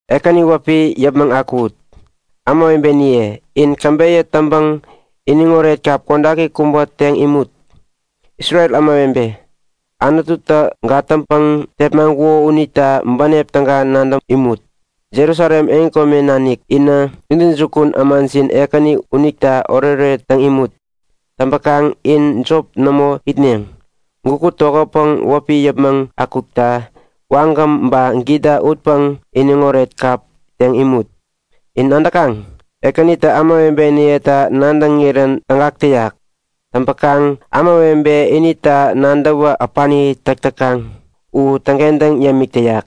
Ekäni wäpi yäpmäŋ akuwut! Ämawebeniye, in käbeyä täŋpäŋ iniŋoret kap kodaki kubä teŋ imut! Isrel ämawebe, Anututä gatäŋpäŋ tepmaŋkuko unita bänep täga nadäŋ imut! Jerusalem yotpärareken nanik inä intäjukun ämajin Ekäni unita oretoret täŋ imut! Täŋpäkaŋ in jop nämo itneŋ. Gukut tokätpäŋ wäpi yäpmäŋ akukta wagäm ba gita utpäŋ iniŋoret kap teŋ imut. In nadäkaŋ? Ekänitä ämawebeniyeta nadäŋirän tägak täyak. Täŋpäkaŋ ämawebe inita nadäwä äpani täk täkaŋ u täŋkentäŋ yämik täyak.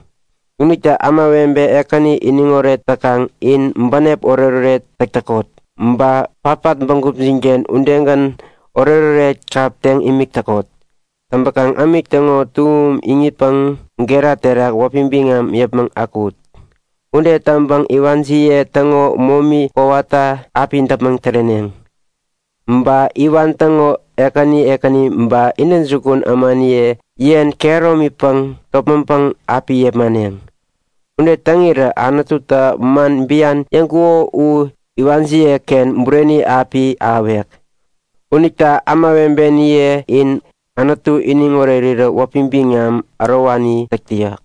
Unita ämawebe Ekäni iniŋoret täkaŋ in bänep oretoret täk täkot. Ba patpat bägupjinken udegän oretoret kap teŋ imik täkot. Täŋpäkaŋ ämik täŋo tuŋum iŋitpäŋ gera terak wäpi biŋam yäpmäŋ akuwut! Ude täŋpäŋ iwanjiye täŋo momi kowata api däpmäŋ täreneŋ. Ba iwan täŋo ekäni ekäni ba intäjukun ämaniye yen kehäromipäŋ topmäŋpäŋ api yepmaneŋ. Ude täŋirä Anututä man bian yäŋkuko u iwanjiyeken bureni api ahäwek. Unita ämawebeniye, in Anutu iniŋ orerirä wäpi biŋam ärowani täk täyak.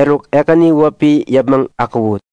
Eruk, Ekäni wäpi yäpmäŋ akuwut!